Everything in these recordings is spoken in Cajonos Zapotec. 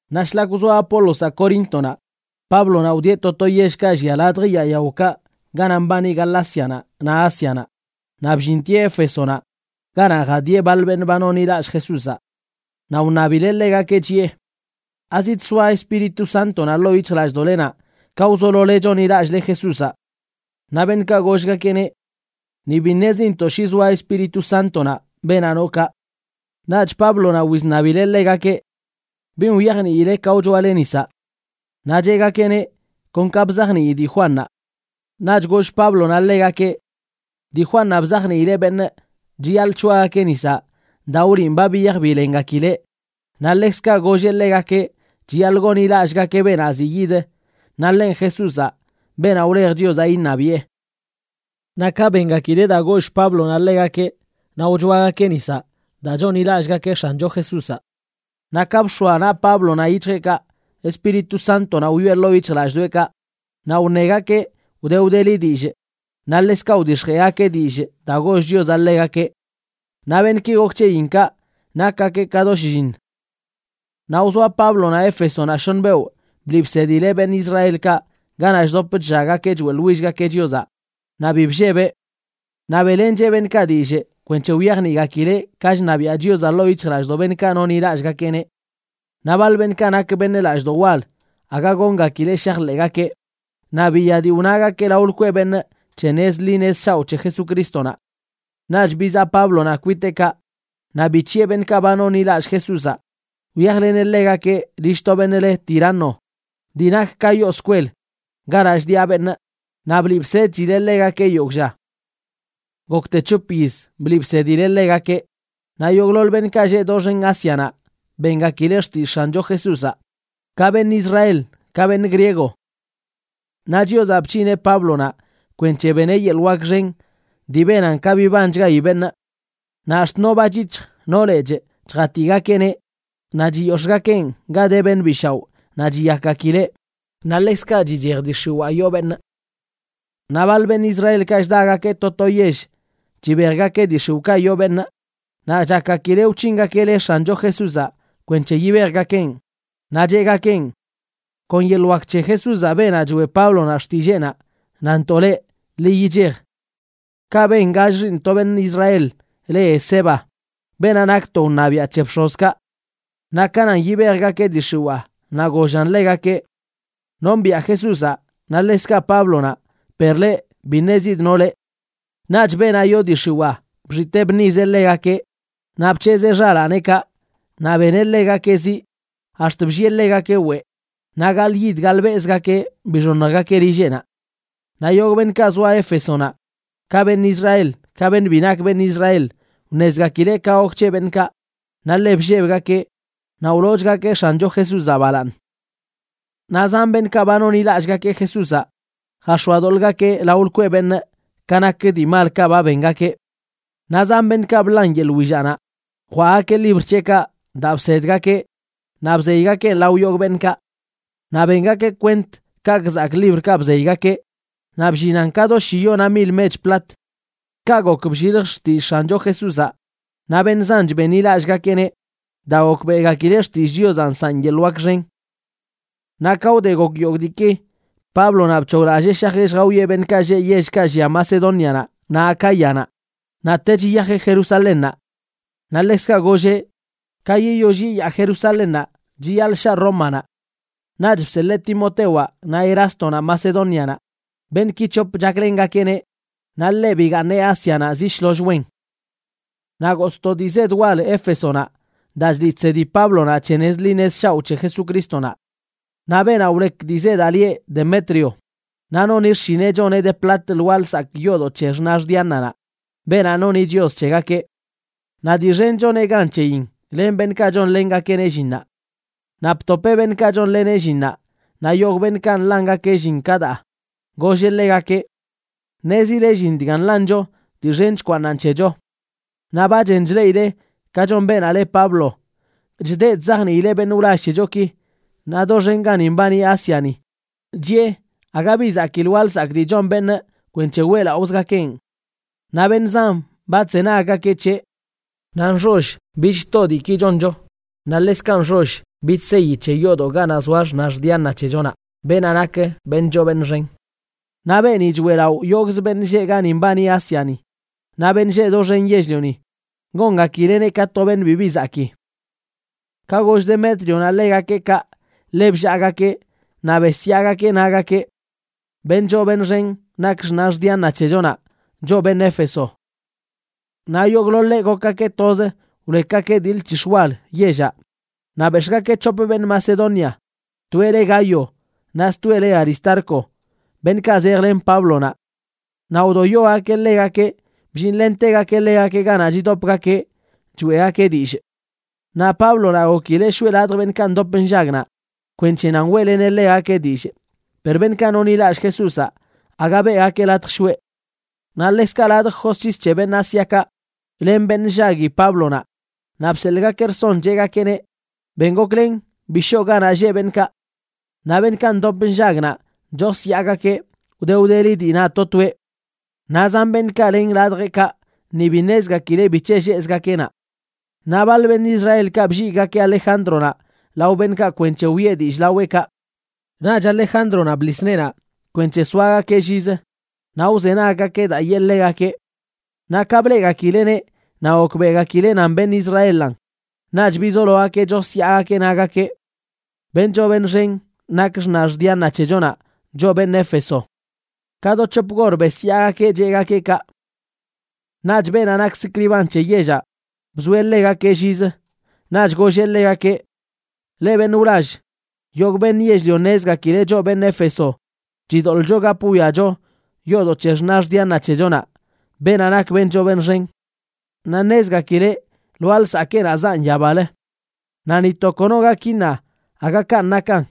Naꞌ shlak wzoa Apólozaꞌ Coríntonaꞌ, Páblonaꞌ wdieꞌ to to yellkaꞌ llia ladj yaa yaokaꞌ ganaꞌ mbani Galácianaꞌ naꞌ Ásianaꞌ, naꞌ bllintieꞌ Éfesonaꞌ ganaꞌ jadiꞌe baḻ beṉꞌ ba nonḻilallꞌ Jesúzaꞌ. Naꞌ wṉabileꞌ ḻegakeꞌ, chiꞌe: ―¿Azidsoa Espíritu Sántonaꞌ ḻoo yic̱hjlallꞌdoꞌlenaꞌ ka wzolole chonḻilallꞌle Jesúzaꞌ? Naꞌ beṉꞌkaꞌ gollgakeꞌneꞌ: ―Ni bi ṉezintoꞌ shi zoa Espíritu Sántonaꞌ beenaꞌ noꞌ kaꞌ. Naꞌch Páblonaꞌ wizṉabileꞌ ḻegakeꞌ: ―¿Bin wyajniile ka wchoale nisaꞌ? Naꞌ cheꞌgakeꞌneꞌ: ―Kon ka bzajnii dii Juannaꞌ. Naꞌch goll Páblonaꞌ ḻegakeꞌ: ―Dii Juannaꞌ bzajniileꞌ beṉꞌ chiyaḻꞌ c̱hoagakeꞌ nisaꞌ daa wliꞌn ba biyaj bilengakileꞌ naꞌ ḻekzkaꞌ golleꞌ ḻegakeꞌ chiyaḻꞌ gonḻilallꞌgakeꞌ beenaꞌ ziꞌ yid, naꞌ ḻenꞌ Jesúzaꞌ, beenaꞌ wlej Chiozaꞌ iṉabiꞌe. Naꞌ ka bengakileꞌ daa goll Páblonaꞌ ḻegakeꞌ, naꞌ wchoagakeꞌ nisaꞌ daa chonḻilallꞌgakeꞌ X̱ancho Jesúzaꞌ. Naꞌ ka bx̱oa naꞌ Páblonaꞌ yic̱hjeꞌkaꞌ, Espíritu Sántonaꞌ wyoꞌe ḻoo yic̱hjlallꞌdoꞌekaꞌ naꞌ wṉegakeꞌ wde wdeli dillꞌ naꞌ ḻekzkaꞌ wdix̱jeꞌgakeꞌ dillꞌ daa goll Chiozaꞌ ḻegakeꞌ. Naꞌ beṉꞌki gok c̱heyin kaꞌ nakgakeꞌ ka do shlliṉ. Naꞌ wzoa Páblonaꞌ Éfesonaꞌ shoṉ beoꞌ bliꞌ bsedileꞌ beṉꞌ Israelkaꞌ ganaꞌ chdop chllaggakeꞌ choeꞌḻwillgakeꞌ Chiozaꞌ naꞌ bi bllebeꞌ. Naꞌ beꞌlencheꞌ beṉꞌkaꞌ dillꞌ kwenc̱he wyajniꞌgakileꞌ ka chṉabiaꞌ Chiozaꞌ ḻoo yic̱hjlallꞌdoꞌ beṉꞌkaꞌ nonḻilallꞌgakeꞌneꞌ. Naꞌ baḻ beṉꞌkaꞌ nak beṉꞌ lallꞌdoꞌ wal aga goongakileꞌ shajḻeꞌgakeꞌ, naꞌ biya dii wnagakeꞌ lao lkweꞌ beṉꞌ c̱he nez ḻi nez shaoꞌ c̱he Jesucrístonaꞌ. Naꞌch bizaꞌ Páblonaꞌ kwiteꞌkaꞌ, naꞌ bic̱hiꞌe beṉꞌkaꞌ ba nonḻilallꞌ Jesúzaꞌ, wyajleneꞌ ḻegakeꞌ lill to beṉꞌ le Tirano dii nak ka yoo skwel ganaꞌ chdiꞌa beṉꞌ, naꞌ bliꞌ bsedchileꞌ ḻegakeꞌ yogꞌ lla. Gokte c̱hop yiz bliꞌ bsedileꞌ ḻegakeꞌ, naꞌ yogꞌḻoḻ beṉꞌkaꞌ lleꞌ doxen Ásianaꞌ bengakileꞌ xtillꞌ X̱ancho Jesúzaꞌ, ka beṉꞌ Israel ka beṉꞌ griego. Naꞌ Chiozaꞌ bc̱hineꞌ Páblonaꞌ kwenc̱he beneꞌ yeḻꞌ wak xen dii benan ka bibanchgayi beṉꞌ. Naꞌ ax̱t no bachyic̱hj, no lechꞌ chjatigakeꞌneꞌ naꞌ chiyox̱ꞌgakeꞌn ga de beṉꞌ bi shaoꞌ naꞌ chiyakgakileꞌ, naꞌ ḻekzkaꞌ chichej dii x̱iwaa yoo beṉꞌ. Naꞌ baḻ beṉꞌ Israelkaꞌ chdagakeꞌ to to yell chibejgakeꞌ dii xiwꞌkaꞌ yoo beṉꞌ, naꞌ chakgakileꞌ wc̱hingakeꞌ le X̱ancho Jesúzaꞌ kwenc̱he yibejgakeꞌn. Naꞌ cheꞌgakeꞌn: ―Kon yeḻꞌ wak c̱he Jesúzaꞌ, beenaꞌ choeꞌ Páblonaꞌ xtilleenaꞌ, nanntoꞌ leꞌ, ḻi yichej. Kaꞌ ben gall xiiṉ to beṉꞌ Israel le Esceva, beenaꞌ nak to wṉabiaꞌ c̱he bx̱ozkaꞌ. Naꞌ ka nan yibejgakeꞌ dii x̱iwaa, naꞌ gollan ḻegakeꞌ: ―Nombiꞌa Jesúzaꞌ, naꞌ ḻekzkaꞌ Páblonaꞌ, per leꞌ, bi ṉezidꞌ no leꞌ. Naꞌch beenaꞌ yoo dii x̱iwaa bxitee bṉizeꞌ ḻegakeꞌ, naꞌ bc̱hezee xalaaneꞌkaꞌ naꞌ beneꞌ ḻegakeꞌ ziꞌ ax̱t bllieꞌ ḻegakeꞌ weꞌ naꞌ gaḻꞌyid gaḻꞌbelꞌzgakeꞌ bixoṉjgakeꞌ lilleꞌnaꞌ. Naꞌ yogꞌ beṉꞌkaꞌ zoa Éfesonaꞌ, ka beṉꞌ Israel ka beṉꞌ bi nak beṉꞌ Israel, wṉezgakileꞌ ka gok c̱he beṉꞌkaꞌ, naꞌ ḻe bllebgakeꞌ naꞌ wloochgakeꞌ X̱ancho Jesúzaꞌ balaaṉ. Naꞌ zan beṉꞌkaꞌ ba nonḻilallꞌgakeꞌ Jesúzaꞌ jax̱oadoḻꞌgakeꞌ lao lkweꞌ beṉꞌ ka nak dii malkaꞌ ba bengakeꞌ. Naꞌ zan beṉꞌkaꞌ bḻan yeḻꞌ willaꞌnaꞌ jwaꞌgakeꞌ libr c̱heꞌkaꞌ daa bsedgakeꞌ naꞌ bzeygakeꞌn lao yogꞌ beṉꞌkaꞌ. Naꞌ bengakeꞌ kwent kaꞌkꞌ zakꞌ librkaꞌ bzeygakeꞌ, naꞌ bllinan ka do shiyona mil mech plat. Kaꞌ gok blliljch xtillꞌ X̱ancho Jesúzaꞌ naꞌ beṉꞌ zanch benḻilallꞌgakeꞌneꞌ daa gokbeꞌgakileꞌ xtillꞌ Chiozaꞌ nsaꞌn yeḻꞌ wak xen. Naꞌ ka wde gok yogꞌ diiki, Páblonaꞌ bc̱hoglallee shajeꞌ lljawieꞌ beṉꞌkaꞌ lleꞌ yellkaꞌ llia Macedónianaꞌ naꞌ Acáyanaꞌ, naꞌtech yiyajeꞌ Jerusalénnaꞌ. Naꞌ ḻekzkaꞌ golleꞌ: “Ka yiyoll yiyaa Jerusalénnaꞌ chiyaḻꞌ shaa Rómanaꞌ.” Naꞌch bseḻee Timotewaꞌ naꞌ Erástonaꞌ Macedónianaꞌ, beṉꞌki c̱hop chaklengakeꞌneꞌ, naꞌ ḻeꞌ bigaaṉeꞌ Ásianaꞌ zi shloll wen. Naꞌ gotꞌ to dii zed wal Éfesonaꞌ daa chliꞌ chsedi Páblonaꞌ c̱he nez ḻi nez shaoꞌ c̱he Jesucrístonaꞌ. Naꞌ beenaꞌ wlek dii zedaꞌ lieꞌ Demetrio, naꞌ noni xshineꞌ choneꞌ de plat lwaa lsakꞌ yoodoꞌ c̱he xnax Diananaꞌ, beenaꞌ noni chios c̱hegakeꞌ. Naꞌ dii xen choneꞌ gan c̱heyin len beṉꞌkaꞌ chonlengakeꞌneꞌ llinnaꞌ. Naꞌ btopeꞌ beṉꞌkaꞌ chonleneꞌ llinnaꞌ naꞌ yogꞌ beṉꞌkaꞌ nḻangakeꞌ llin ka daa, golleꞌ ḻegakeꞌ: ―Ṉezile llin dga nḻancho dii xen chkwaaṉan c̱hecho. Naꞌ ba chen chleꞌile ka chon beenaꞌ le Pablo, chdeꞌ chzajniileꞌ beṉꞌ wlall c̱hechoki naꞌ doxen gani mbani Ásiani, chiꞌe aga bi zakii lwaa lsakꞌ dii chon beṉꞌ kwenc̱he weꞌlaꞌozgakeꞌn. Naꞌ beṉꞌ zan ba chzenaggakeꞌ c̱heꞌ. Naꞌ nxoll bich too diiki choncho, naꞌ ḻekzkaꞌ nxoll bich seyi c̱he yoodoꞌ ganaꞌ zoa xnax Diana c̱hechonaꞌ, beenaꞌ nak beṉꞌ choo beṉꞌ xen. Naꞌ beeni choeꞌlaꞌo yogꞌzə beṉꞌ lleꞌ gani mbani Ásiani naꞌ beṉꞌ lleꞌ doxen yell-lioni, gongakileꞌneꞌ ka to beṉꞌ bibi zakii. Ka goll Demétrionaꞌ ḻegakeꞌ kaꞌ, ḻe bllaagakeꞌ naꞌ besyaagakeꞌ, nagakeꞌ: ―¡Beṉꞌ choo beṉꞌ xen nak xnax Diana c̱hechonaꞌ, choꞌ beṉꞌ Éfeso! Naꞌ yogꞌḻoḻeꞌ gokgakeꞌ toz, wlekgakeꞌ dii lc̱hix̱ wal yellaꞌ, naꞌ bex̱ꞌgakeꞌ c̱hop beṉꞌ Macedonia, toeꞌ le Gayo, naꞌ stoeꞌ le Aristarco, beṉꞌkaꞌ zejlen Páblonaꞌ. Naꞌ wdoyogakeꞌ ḻegakeꞌ bllinlentegakeꞌ ḻegakeꞌ ganaꞌ chidopgakeꞌ choeꞌgakeꞌ dillꞌ. Naꞌ Páblonaꞌ gokileꞌ shoꞌe ladj beṉꞌkaꞌ ndop nllag naꞌ kwenc̱he nan weꞌleneꞌ ḻegakeꞌ dillꞌ, per beṉꞌkaꞌ nonḻilallꞌ Jesúzaꞌ aga beꞌgakeꞌ latj shoꞌe. Naꞌ ḻekzkaꞌ ladj josc̱his c̱he beṉꞌ Ásiakaꞌ len beṉꞌ nllagui Páblonaꞌ, naꞌ bseḻꞌgakeꞌ rson, cheꞌgakeꞌneꞌ: ―Ben goklen, bi shoo ganaꞌ lleꞌ beṉꞌkaꞌ. Naꞌ beṉꞌkaꞌ ndop nllag naꞌ chosyaagakeꞌ, wde wdeli dii na to toeꞌ. Naꞌ zan beṉꞌkaꞌ len ladjeꞌkaꞌ ni bi ṉezgakileꞌ bic̱he lleꞌzgakeꞌ naꞌ. Naꞌ baḻ beṉꞌ Israelkaꞌ blligꞌgakeꞌ Alejándronaꞌ lao beṉꞌkaꞌ kwenc̱he wiꞌe dillꞌ laweꞌkaꞌ. Naꞌch Alejándronaꞌ bḻis neenaꞌ kwenc̱he soagakeꞌ llizə naꞌ wzenaggakeꞌ daa yee ḻegakeꞌ. Naꞌ ka bleꞌgakileꞌneꞌ naꞌ gokbeꞌgakileꞌ nan beṉꞌ Israelan, naꞌch bizologakeꞌ chosyaagakeꞌ, nagakeꞌ: ―¡Beṉꞌ choo beṉꞌ xen nak xnax Diana c̱hechonaꞌ, choꞌ beṉꞌ Éfeso! Ka do c̱hop gor besyaagakeꞌ cheꞌgakeꞌ kaꞌ. Naꞌch beenaꞌ nak sikriban c̱he yellaꞌ bzoeꞌ ḻegakeꞌ llizə. Naꞌch golleꞌ ḻegakeꞌ: ―Leꞌ beṉꞌ wlall, yogꞌ beṉꞌ yell-lio ṉezgakileꞌ choꞌ beṉꞌ Éfeso chidoḻꞌcho gap wwiacho yoodoꞌ c̱he xnax Diana c̱hechonaꞌ, beenaꞌ nak beṉꞌ choo beṉꞌ xen. Naꞌ ṉezgakileꞌ lwaa lsakeenaꞌ zaꞌn yabalə, naꞌ ni to kono gak iṉa aga kanꞌ nakan.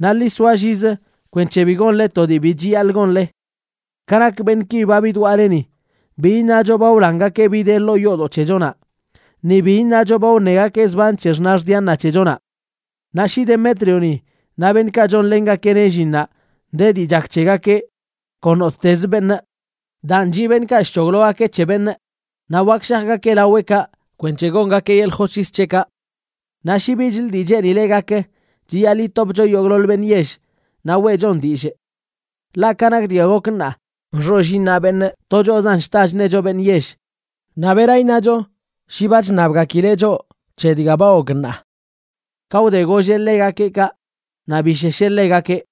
Naꞌ ḻi soa llizə kwenc̱he bi gonle to dii bi chiyaḻꞌ gonle. Ka nak beṉꞌki ba bidwaꞌle ni, bi iṉacho ba wlangakeꞌ bi de ḻoo yoodoꞌ c̱hechonaꞌ, ni bi iṉacho ba wṉegakeꞌ zban c̱he xnax Diana c̱hechonaꞌ. Naꞌ shi Demétrioni naꞌ beṉꞌkaꞌ chonlengakeꞌneꞌ llinnaꞌ de dii chak c̱hegakeꞌ kon nottezə beṉꞌ, daan chiꞌ beṉꞌkaꞌ chc̱hoglogakeꞌ c̱he beṉꞌ naꞌ wak shajgakeꞌ laweꞌkaꞌ kwenc̱he gongakeꞌ yeḻꞌ josc̱his c̱heꞌkaꞌ. Naꞌ shi bichlə dii cheenile gak, chiyaḻꞌ yitopcho yogꞌḻoḻ beṉꞌ yell naꞌ weꞌchon dillꞌ. Ḻaꞌ ka nak dga gok ṉaa, nxoll iṉa beṉꞌ to choꞌzan chta chṉecho beṉꞌ yell, naꞌ ¿bera iṉacho shi ba chṉabgakileꞌ choꞌ c̱he dga ba gok ṉaa? Ka wde golleꞌ ḻegakeꞌ kaꞌ, naꞌ bishesheꞌ ḻegakeꞌ.